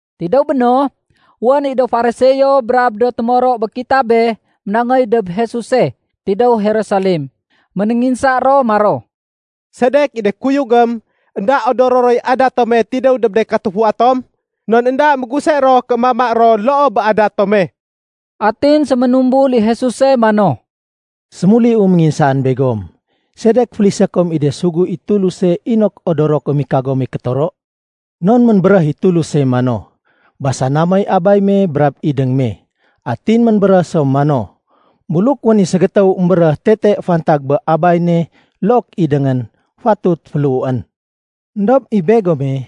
Tidéw béno, wén i do Fariseo brab do témoro bé kitabé ménangéy dob Jesuse tidéw Jerusalem. Ménénginsa ro maro, “Sedek i de kuyugém énda odoro roy adat tome tidéw dob de katufua tom? Non énda méguse ro ké mama ro loo bé adat tome.” Atin séménumbul i Jesuse mano, “Sémuliu ménginsaan begom. Sedek félisé kom i de sugu i Tuluse inok odoro kom i kagome kétoro? Non ménbéréh i Tuluse mano, ‘Basana moy abay me brab idéng me.’ Atin ménbéréh so mano, ‘Buluk wén i ségétéw émbéréh tete fantag bé abay ne look idéngén, fatut féléhuén.’ Endob i begome,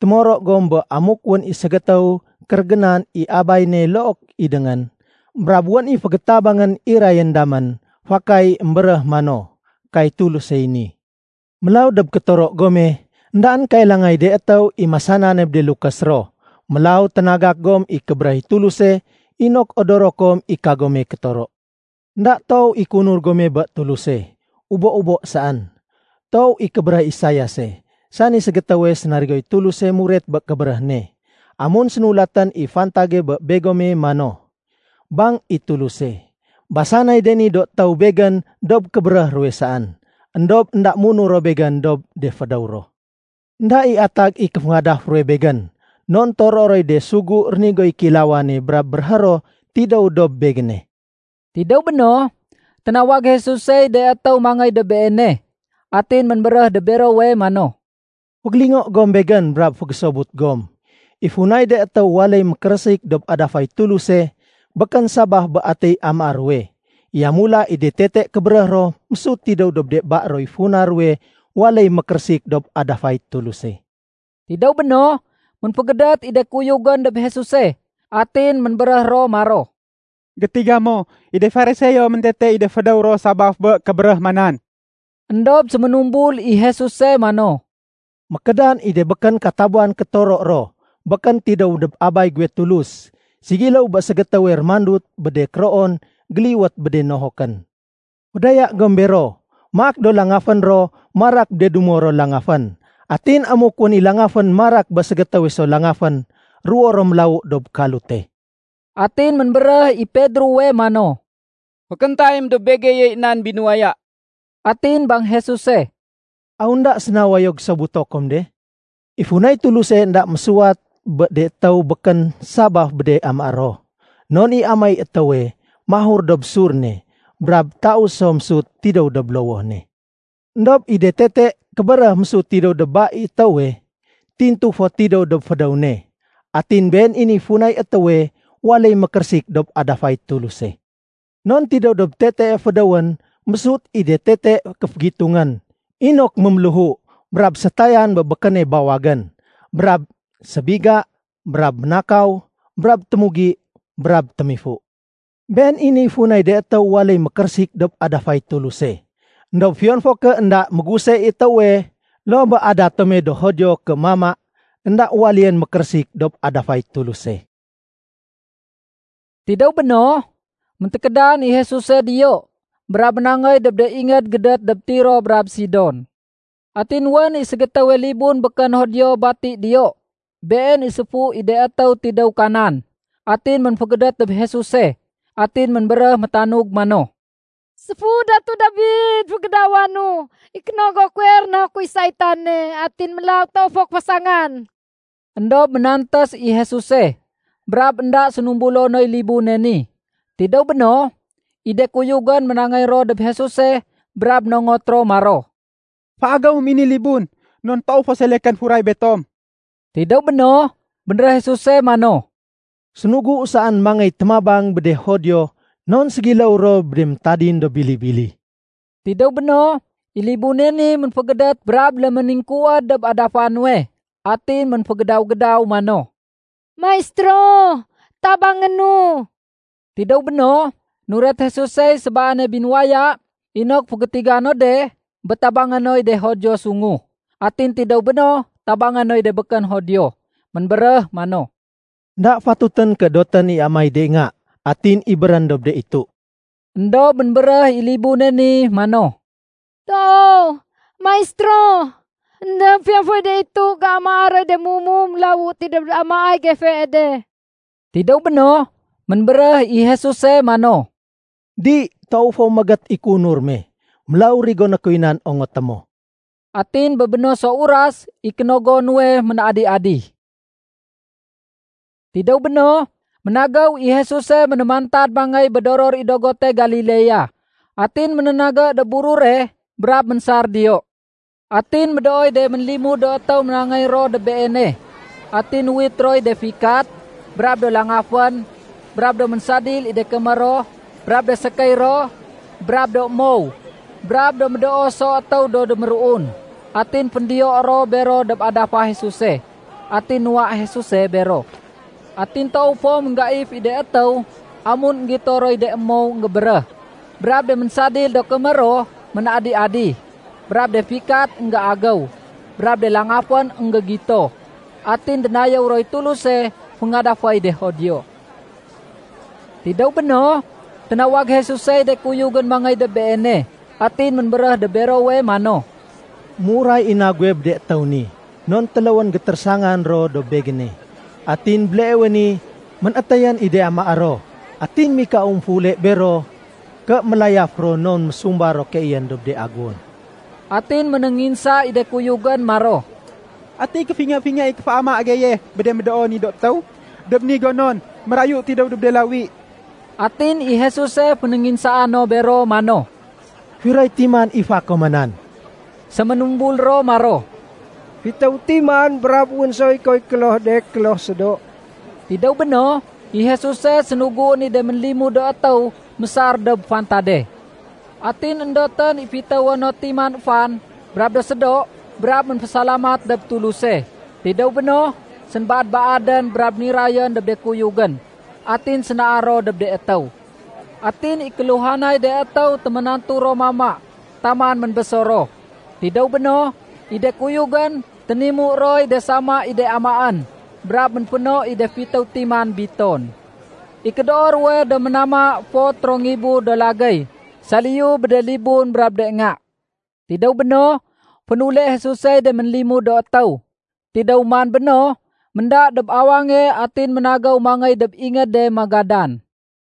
témoro gom bé amuk wén i ségétéw kérégénan i abay ne look idéngén, brab wén i fégétabangén irayén damén, fakay émbéréh mano, ‘Kay Tulusey ni.’ Mélaw dob kétoro gome, éndaén kailangay de étéw i masanane bé de lukés ro. Mélaw ténagak gom i kébéréh i Tuluse inok odoro kom i kagome kétoro. Enda toow i kéunur gome bé Tuluse, ubo-ubo saén. Toow i kébéréh Isaiase, sani ségétéwe sénarigoy Tuluse muret bé kébéréh ne, amun sénulatén i fantage bé begome mano, ‘Bang i Tuluse, basanay de ni do étéw Begén dob kébéréh ruwe saén. Endob énda munur ro Begén dob de fédéw ro. Enda i atag i kéféngadaf ruwe Begén, non toroé roy de sugu rénigoy kéilawane brab béréhé ro tidéw dob Begéne.’” Tidéw béno, ténawag Jesusey de étéw mangéy dob Beene. Atin ménbéréh dob berowe mano, “Fégélingo gom Begén brab fégésobut gom. I funay de étéw waléy mékérésik dob adafay Tuluse, békén sabaf bé atiy amaé ruwe. Yamula, i de tete kébéréh ro mésut tidéw dob de ba roy funa ruwe waléy mékérésik dob adafay Tuluse.” Tidéw béno, ménfégédét i de kuyugén dob Jesuse, atin ménbéréh ro maro, “Gétiga mo, i de Fariseo méntete i de fédéw ro sabaf bé kébéréh ma nan?” Endob séménumbul i Jesuse mano, “Mékédan i de békén katabuwan kétoro ro békén tidéw dob Abay guwe Tulus, ségiléw bé ségétéwe rémandut bé de kéroon géliwét bé de nohokén. Fédaya gom bero. Maak do langafén ro marak bé de dumo ro langafén. Atin amuk wén i langafén marak bé ségétéwe so langafén, ruwo ro mélawu dob kalute.” Atin ménbéréh i Pedrowe mano, “Fékéntayém dob begeyey nan binuwaya.” Atin bang Jesuse, “Aw énda séna wayo gésobuto kom de? I funay Tuluse énda mésuwat bé de étéw békén sabaf bé de amaé ro. Non i amaéy étéwe, mahur dob sur ne brab taus so mésut tidéw dob lowoh ne. Endob i de tete kébéréh mésut tidéw dob ba i étéwe, tintu fo tidéw dob fédéw ne. Atin been i niy funay étéwe waléy mékérésik dob adafay Tuluse. Non tidéw dob tetee fédéwén mésut i de tete kéfégitungén inok méméléhu, brab sétayan bé békéne bawagén, brab sébiga, brab ménakaw, brab témugi, brab témifu. Been i niy funay de étéw waléy mékérésik dob adafay Tuluse. Endob fiyon fo ké énda méguse i étéwe loo bé adat tome do Judio ké mama, énda waléyén mékérésik dob adafay Tuluse.” Tidéw béno, méntékédan i Jesuse diyo brab ménangéy dob de ingéd gédét dob Tiro brab Sidon. Atin wén i ségétéwe libun békén Judio bati diyo. Been i séfu i de étéw tidéw Kanan. Atin ménfégédét dob Jesuse. Atin ménbéréh métanug mano, “Séfu Datu Dabid, fégédawanu! I kénogo kuwe rénahukoy saitane atin mélaw toow fo kéfasangan.” Endob ménantés i Jesuse brab énda sénumbulo noy libune ni. Tidéw béno, i de kuyugén ménangéy ro dob Jesuse brab nongot ro maro, “Féagéwém i ni libun non toow fo selekén furay betom.” Tidéw béno, bénréh Jesuse mano, “Sénuguu saén mangéy témabang bé de Judio non ségiléw ro bé de méntadin do bili-bili.” Tidéw béno, i libune ni ménfégédét brab léméningkuwéd dob adafa nuwe. Atin ménfégédaw-gédaw mano, “Maistéro, tabangénu.” Tidéw béno, nuret Jesusey sébaane binuwaya inok fégétiga no de bé tabangé noy de Judio sungu, atin tidéw béno tabangé noy de békén Judio. Ménbéréh mano, “Enda fatutén ké dotén i amaéy de nga atin ibérén dob de itu.” Endob ménbéréh i libune ni mano, “Toow, Maistéro, éndob fiyon foy de itu géamaa roy de mumu mélawu tidéw dob amaéy gefee de.” Tidéw béno, ménbéréh i Jesuse mano, “Di, méégét i kéunur me fo toow. Mélaw rigoné kuy nan ongoté mo.” Atin bé no so uras i kénogo nuwe ménadi-adi. Tidéw béno, ménagéw i Jesuse ménémantad mangéy bé doror i dogote Galilea. Atin ménénagé dob burure brab ménsar diyo. Atin médooy de ménlimud do étéw ménangéy ro dob Beene, atin nuwit roy de fikat, brab do langafén, brab do ménsadil i de kémér ro brab de sékéy ro, brab do mow, brab do médoo so étéw do déméruun. Atin féndiyo ro bero dob adafa Jesuse. Atin nuwa Jesuse bero. Atin toow fo ménggaif i de étéw amun énggito roy de mow énggébéréh, brab de ménsadil do kémér ro ménadi-adi, brab de fikat énggéagéw, brab de langafén énggégito. Atin dénayéw roy Tuluse féngadaféy de Judio. Tidéw béno, ténawag Jesusey de kuyugén mangéy dob Beene. Atin ménbéréh dob berowe mano, “Méuray i na guwe bé de étéw ni, non téléwén gétérésangan ro dob Begéne, atin béleewe ni ménétéyén i de amaé ro. Atin mikau émféule bero ké mélayaf ro non mésumba ro keeyén dob de aguwon.” Atin ménénginsa i de kuyugén maro, “Ati kéfingé-fingé i kéféama geye bé de médoo ni do étéw dob ni gonon mérayu tidéw dob de lawi?” Atin i Jesuse fénénginsaa no bero mano, “Firoy timan i fa koman?” Séménumbul ro maro, “Fitéw timan brab wén soy koy kloh de kloh sédo.” Tidéw béno, i Jesuse sénuguén i de ménlimud do étéw mésar dob fantade. Atin éndotén i fitéwo no timan fan brab do sédo, brab ménfésalamat dob Tuluse. Tidéw béno, sénbaad-baadén, brab nirayén dob de kuyugén. Atin sénaar ro dob de étéw. Atin i kéluhanay de étéw téménantu ro mama taman ménbésor ro. Tidéw béno, i de kuyugén ténimu roy de sama i de amaén brab ménféno i de fitéw timan biton. I kédoo ruwe do ménama fot ro ngibu do lagéy saliyu bé de libun brab de nga. Tidéw béno, fénule Jesusey de ménlimud do étéw. Tidéw man béno, ménda dob awange atin ménagéw mangéy dob ingéde Magadan.